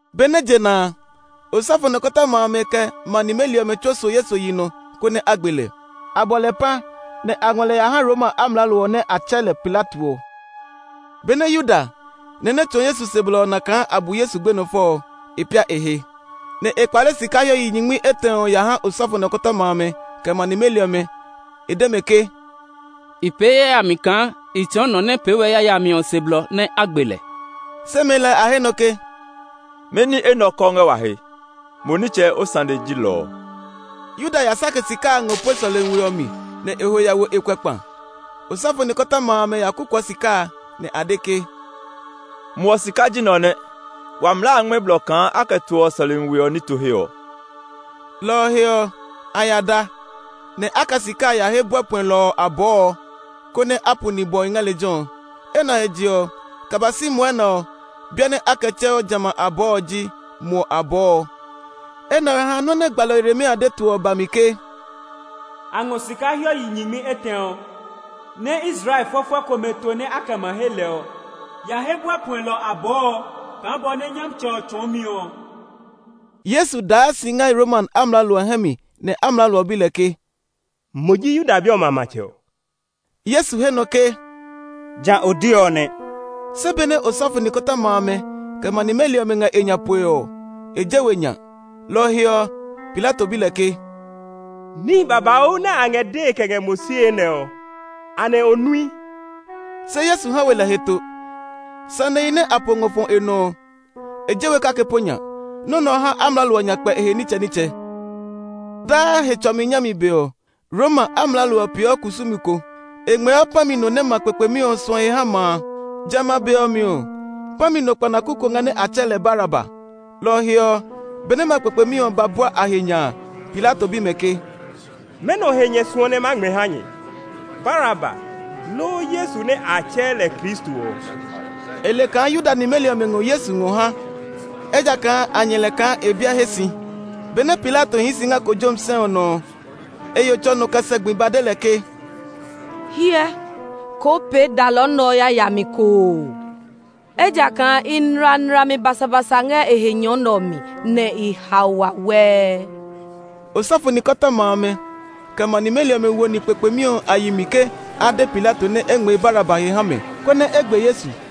Benɛ je na a, osɔfo nikɔtɔma amɛ, kɛ ma nimeli ɔmɛ tsuo so Yesu yi nɔ, konɛ a gbe lɛ. A bɔ lɛ pã, nɛ a ngɔ lɛ ya ha Roma amlaalo ɔ nɛ a tsɛɛ lɛ Pilato ɔ. Benɛ Yuda, nɔ nɛ tsɔɔ Yesu se blɔ ɔ na kaa a bu Yesu gbenɔ fɔ ɔ, e pia e he, nɛ e kpale sika hiɔ yi nyingmi etɛ ɔ ya ha osɔfo nikɔtɔma amɛ, kɛ ma nimeli ɔmɛ. E de mɛ ke “I pee yayami kaa i tsɔɔ nɔ nɛ pee we yayami ɔ se blɔ nɛ a gbe lɛ.” Se mɛɛ lɛɛ a he nɔ ke, “Mɛni enɛ ɔ kɔɔ ngɛ wa he? Mo nitsɛ o sane ji lɔ ɔ!” Yuda ya sake sika a ngɔ pue sɔlemi we ɔ mi, nɛ e ho ya wo e kuɛ kpa. Osɔfo nikɔtɔma amɛ ya kukuɔ sika a, nɛ a de ke, “Muɔ sika ji nɛ ɔ nɛ; wa mlaa a ngmɛ́ blɔ kaa a kɛ toɔ sɔlemi we ɔ nito he ɔ.” Lɔ ɔ he ɔ, a ya da, nɛ a kɛ sika a he buɛ puɛlɔ ɔ abɔɔ ɔ, konɛ a pu nibwɔhi ngɛ lejɛ ɔ. Enɛ ɔ he je ɔ, kɛ ba si mwɔnɛ ɔ, biɛ nɛ a kɛ tsɛɔ jamɛ a abɔɔ ɔ ji “Muɔ Abɔɔ.” Enɛ ɔ ha nɔ́ nɛ gbalɔ Yeremia de to ɔ ba mi ke, “A ngɔ sika hiɔ yi nyingmi etɛ ɔ, nɛ Israel fɔfɔɛ komɛ to nɛ a kɛ ma he lɛ ɔ ya he buɛ puɛlɔ ɔ abɔɔ ɔ kaa bɔ nɛ Nyɔmtsɛ ɔ tsɔɔ mi ɔ.” Yesu daa si ngɛ Roma amlaalo ɔ hɛ mi, nɛ amlaalo ɔ bi lɛ ke, “Mo ji Yuda bi ɔmɛ a matsɛ ɔ?” Yesu he nɔ ke, “Ja o de ɔ nɛ.” Se benɛ osɔfo nikɔtɔma amɛ, kɛ ma nimeli ɔmɛ ngɛ e nya poe, e je we nya. Lɔ ɔ he ɔ, Pilato bi lɛ ke, “Níhi babauu nɛ a ngɛ dee kɛ ngɛ mo sie nɛ ɔ, anɛ o nui?” Se Yesu ha we lɛ heto; sanehi nɛ a po ngɔ fɔ e nɔ ɔ, e je we kake po nya. Nɔ́ nɛ ɔ ha amlaalo ɔ nya kpɛ e he nitsɛnitsɛ. Daa Hetsɔmi nyami be ɔ, Roma amlaalo ɔ peeɔ kusumi ko; e ngmɛɛɔ pã mi no nɛ ma kpekpemi ɔ suɔ he haa ma a. Jamɛ a be ɔ mi ɔ, pã mi no kpanaku ko ngɛ nɛ a tsɛɛ lɛ Baraba. Lɔ ɔ he ɔ, benɛ ma kpekpemi ɔ ba bua a he nya a, Pilato bi mɛ ke, “Mɛnɔ he nyɛ suɔ nɛ ma ngmɛɛ ha nyɛ, Baraba, loo Yesu nɛ a tsɛɛ lɛ Kristo ɔ?” E le kaa Yuda nimeli ɔmɛ ngɔ Yesu ngɔ ha, ejakaa a nyɛ lɛ kaa e biɛ he si. Benɛ Pilato hii si ngɛ kojomi sɛ ɔ nɔ ɔ, e yo tsɔ nɔ kɛ sɛ gbi ba de lɛ ke, “Hyɛ, koo pee dalɔ nɛ ɔ yayami ko oo! Ejakaa i nla nlami basabasa ngɛ e he nyɔ nɛ ɔ mi, nɛ i hao wawɛɛ.” Osɔfo nikɔtɔma amɛ, kɛ ma nimeli ɔmɛ wo ni kpekpemi ɔ a yi mi ke a de Pilato nɛ e ngmɛɛ Baraba he ha mɛ, konɛ e gbe Yesu.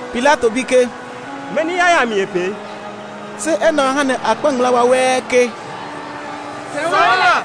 Pilato bi ke, “Mɛni yayami e pee?” Se enɛ ɔ ha nɛ a kpa ngmlaa wawɛɛ ke, “Sɛu lɛ!”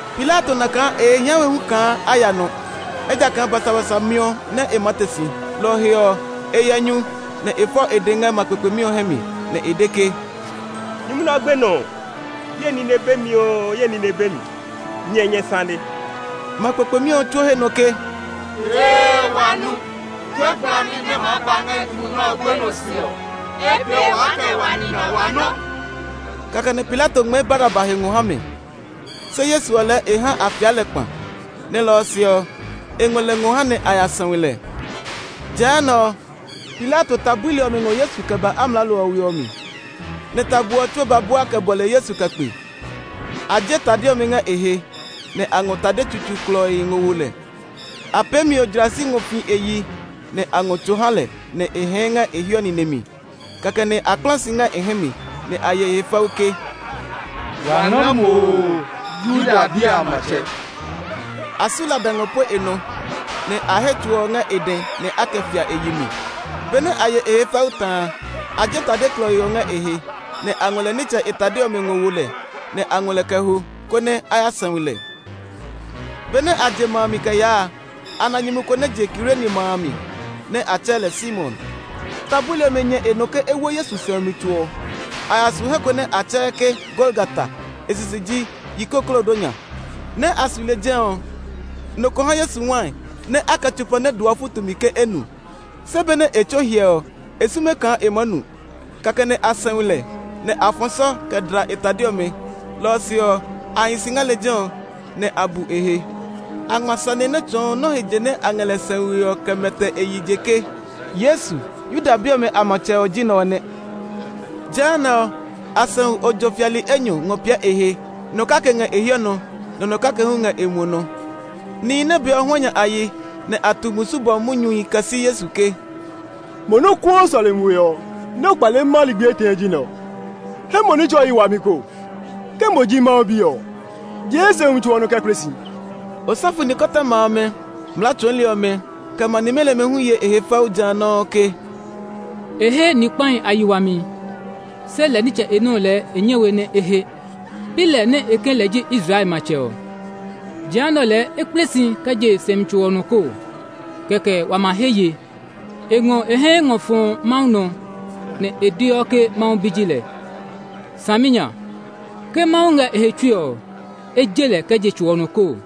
Pilato na kaa e he hia we hu kaa a ya nɔ, ejakaa basabasa miɔ nɛ e maa te si. Lɔ ɔ he ɔ, e yɛ nyu, nɛ e fɔ e dɛ ngɛ ma kpekpemi ɔ hɛ mi, nɛ e de ke, “Nyumu nɛ ɔ gbenɔ ɔ, ye nine be mi oo, ye nine be mi! Nyɛ, nyɛ sane!” Ma kpekpemi ɔ tsuo he nɔ ke, “Ee, wa nu! Tue gblami nɛ maa ba ngɛ nyumu nɛ ɔ gbenɔ se ɔ, e pee waa kɛ wa nina wa nɔ!” Kɛkɛ nɛ Pilato ngmɛɛ Baraba he ngɔ ha mɛ. Se Yesu ɔ lɛɛ e ha a fia lɛ kpa, nɛ lɔ ɔ se ɔ, e ngɔ lɛ ngɔ ha nɛ a ya sɛu lɛ. Jehanɛ ɔ, Pilato ta buli ɔmɛ ngɔ Yesu kɛ ba amlaalo ɔ we ɔ mi; nɛ tabo ɔ tsuo ba bua kɛ bɔle Yesu kɛ kpe. A je tade ɔmɛ ngɛ e he, nɛ a ngɔ tade tsutsuu klɔii ngɔ wo lɛ. A pee mio jlasi ngɔ fi e yi, nɛ a ngɔ tso ha lɛ nɛ e hɛɛ ngɛ e hiɔ nine mi. Kɛkɛ nɛ a kpla si ngɛ e hɛ mi, nɛ a ye e he fɛu ke, “Wa nga mo oo, Yuda bi a matsɛ!” A su lada ngɔ pue e nɔ, nɛ a he tso ɔ ngɛ e dɛ nɛ a kɛ fia e yi mi. Benɛ a ye e he fɛu ta a, a je tade klɔii ɔ ngɛ e he, nɛ a ngɔ lɛ nitsɛ e tade ɔmɛ ngɔ wo lɛ. Nɛ a ngɔ lɛ kɛ ho, konɛ a ya sɛu lɛ. Benɛ a je ma a mi kɛ yaa a, a na nyumu ko nɛ je Kirene ma a mi, nɛ a tsɛɛ lɛ Simon. Ta buli ɔmɛ nyɛ e nɔ ke e wo Yesu sɛumi tso ɔ. A ya su he ko nɛ a tsɛɛ ke Golgata; e sisi ji “Yikoklodonya.” Nɛ́ a su lejɛ ɔ, nɔ ko ha Yesu wai nɛ a kɛ tsopa nɛ dooɔ futu mi ke e nu; se benɛ e tso hyɛ ɔ, e sume kaa e maa nu. Kɛkɛ nɛ a sɛu lɛ, nɛ a fɔ sɔ kɛ dla e tade ɔmɛ. Lɔ ɔ se ɔ, a hi si ngɛ lejɛ ɔ, nɛ a bu e he. A ngma sane nɛ tsɔɔ nɔ́ he je nɛ a ngɛ lɛ sɛue ɔ kɛ mɛtɛ e yi je ke, “Yesu, Yuda bi ɔmɛ a matsɛ ɔ ji nɛ ɔ nɛ.” Jehanɛ ɔ, a sɛu ojo fiali enyɔ ngɔ piɛ e he; nɔ kake ngɛ e hiɔ nɔ, nɛ nɔ kake hu ngɛ e muɔ nɔ. Nihi nɛ bee ɔ huanya yi, nɛ a tu musu bɔmi munyuhi kɛ si Yesu ke, “Mo nɛ o kuɔ sɔlemi we ɔ, nɛ o kpaleɔ maa lɛ ligbi etɛ ɔ ji nɛ ɔ! He mo nitsɛ o yi wami koo! Ke mo ji Mawu Bi ɔ, jee sɛumi tso ɔ nɔ kɛ kple si!” Osɔfo nikɔtɔma amɛ, mlaa tsɔɔli ɔmɛ, kɛ ma nimeli ɔmɛ hu ye e he fɛu ja nɔuu ke, “E he ni kpahi a yi wami, se lɛ nitsɛ e nɔ́ lɛɛ e nyɛ we nɛ e he! Pi lɛ nɛ e ke lɛ ji Israel matsɛ ɔ! Jehanɛ ɔ lɛɛ é kple si kɛ je sɛumi tso ɔ nɔ koo, kɛkɛ wa ma he ye! E ngɔ e hɛ ngɔ fɔ Mawu nɔ, nɛ e deɔ ke Mawu Bi ji lɛ. Saminya! Ke Mawu ngɛ e he tsui ɔ, e je lɛ kɛ je tso ɔ nɔ koo!”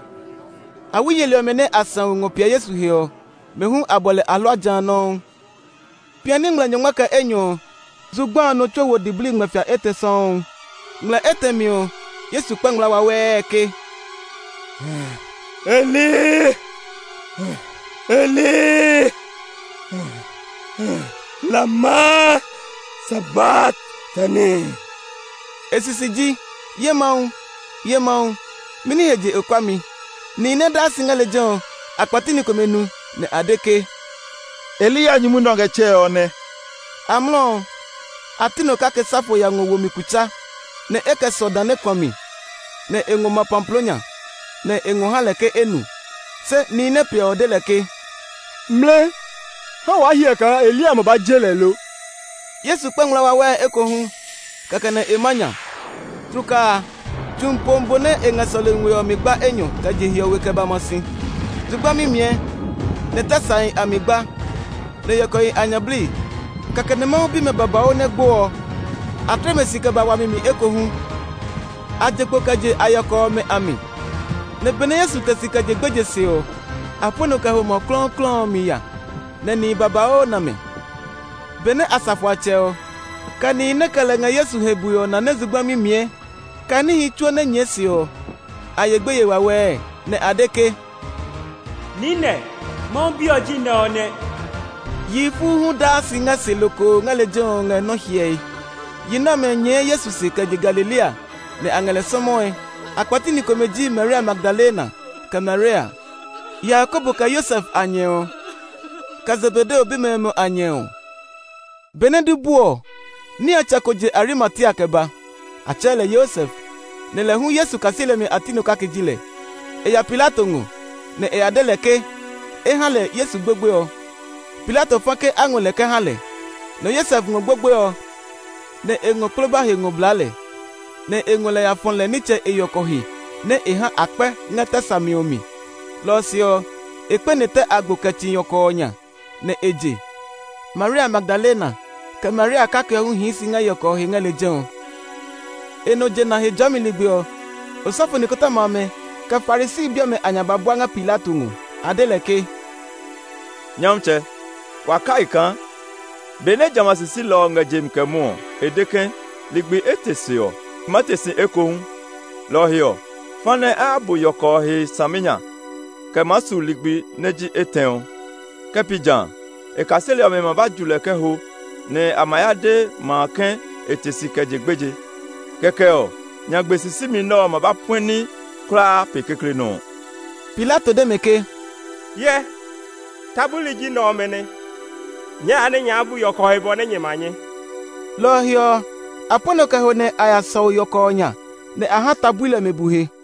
Awi yeli ɔmɛ nɛ a sɛu ngɔ piɛ Yesu he ɔ, mɛ hu a bɔ lɛ ahlua ja nɔuu. Piani ngmlɛ nyɔngma kɛ enyɔ ɔ, zugba a nɔ tsuo wo diblii ngmlɛfia etɛ sɔuu. Ngmlɛ etɛ mi ɔ, Yesu kpa ngmlaa wawɛɛ ke, “Eli, Eli, lama sabaktani?” E sisi ji, “Ye Mawu, ye Mawu, mɛni he je o kua mi?” Nihi nɛ daa si ngɛ lejɛ ɔ, a kpɛti ni komɛ nu, nɛ a de ke, “Eliya nyumu nɛ ɔ ngɛ tsɛe ɔ nɛ.” Amlɔ ɔ, a ti nɔ kake sa fo ya ngɔ wo mi kutsa, nɛ e kɛ sɔ dã nɛ kuã mi, nɛ e ngɔ ma pamploo nya, nɛ e ngɔ ha lɛ ke e nu. Se nihi nɛ piɛ ɔ de lɛ ke, “Mlɛ! Ha waa hyɛ kaa Eliya ma ba je lɛ lo!” Yesu kpa ngmlaa wawɛɛ ekohu; kɛkɛ nɛ e ma nya. Tlukaa a, tsu mi pomi bo nɛ ngɛ sɔlemi we ɔ mi gba enyɔ kɛ je hiɔwe kɛ ba ma si. Zugba mimiɛ, nɛ tɛ sahi a mi gba, nɛ yɔkɔhi a nya bli. Kɛkɛ nɛ Mawu bimɛ babauu nɛ gbo ɔ, a tle mɛ si kɛ ba wami mi ekohu. A je kpo kɛ je a yɔkɔ ɔmɛ a mi, nɛ benɛ Yesu te si kɛ je gbeje se ɔ, a pue nɔ kɛ ho ma klɔuklɔu ɔ mi ya nɛ nihi babauu na mɛ. Benɛ asafoatsɛ ɔ, kɛ nihi nɛ kɛ lɛ ngɛ Yesu he bue ɔ na nɛ zugba mimiɛ, kɛ níhi tsuo nɛ nyɛɛ se ɔ, a ye gbeye wawɛɛ, nɛ a de ke, “Niinɛ, Mawu Bi ɔ ji nɛ ɔ nɛ!” Yihi fuu hu daa si ngɛ se lokoo ngɛ lejɛ ɔ ngɛ nɔ́ hyɛe. Yi nɛ ɔmɛ nyɛɛ Yesu se kɛ je Galilea, nɛ a ngɛ lɛ sɔmɔe. A kpɛti ni komɛ ji Maria Magdalena, kɛ Maria, Yakobo kɛ Yosef a nyɛ ɔ, kɛ Zebedeo bimɛ ɔmɛ a nyɛ ɔ. Benɛ du bu ɔ, niatsɛ ko je Arimatia kɛ ba. A tsɛɛ lɛ Yosef, nɛ lɛ hu Yesu kaseli ɔmɛ a ti nɔ kake ji lɛ. E ya Pilato ngɔ, nɛ e ya de lɛ ke e ha lɛ Yesu gbogboe ɔ. Pilato fa ke a ngɔ kɛ ha lɛ. Nɛ Yosef ngɔ gbogboe ɔ, nɛ e ngɔ kploba he ngɔ blaa lɛ, nɛ e ngɔ lɛ ya fɔ lɛ nitsɛ e yɔkɔ he nɛ e ha a kpɛ ngɛ tɛ sa mi ɔ mi. Lɔ ɔ se ɔ, e kpɛne tɛ agbo kɛ tsi yɔkɔ ɔ nya, nɛ e je. Maria Magdalena, kɛ Maria kake ɔ hu hii si ngɛ yɔkɔ ɔ he ngɛ lejɛ ɔ. E nɔ jena Hejɔɔmi ligbi ɔ, osɔfo nikɔtɔma amɛ, kɛ Farisi bi ɔmɛ a nya ba bua ngɛ Pilato ngɔ. A de lɛ ke, “Nyɔmtsɛ, wa kai kaa benɛ jamɛ a sisilɔ ɔ ngɛ je mi kɛ mwɔɔ ɔ, e de ke, ‘Ligbi etɛ se ɔ, ma te si ekohu.’ Lɔ ɔ he ɔ, fa nɛ a ya bu yɔkɔ ɔ he saminya kɛ maa su ligbi nɛ ji etɛ ɔ. Ke pi jã a, e kaseli ɔmɛ ma ba ju lɛ kɛ ho, nɛ a ma ya de ma a ke e te si kɛ je gbeje. Kɛkɛ ɔ, nyagbe sisimi nɛ ɔ ma ba puɛ ní kulaa pe kekle nɔ́ ɔ.” Pilato de mɛ ke, “Hyɛ, ta buli ji nɛ ɔmɛ nɛ! Nyɛɛ ya nɛ nyɛ ya bu yɔkɔ ɔ he bɔ nɛ nyɛ ma nyɛ.” Lɔ ɔ he ɔ, a pue nɔ kɛ ho nɛ a ya sɔu yɔkɔ ɔ nya. Nɛ a ha ta buli ɔmɛ bu he.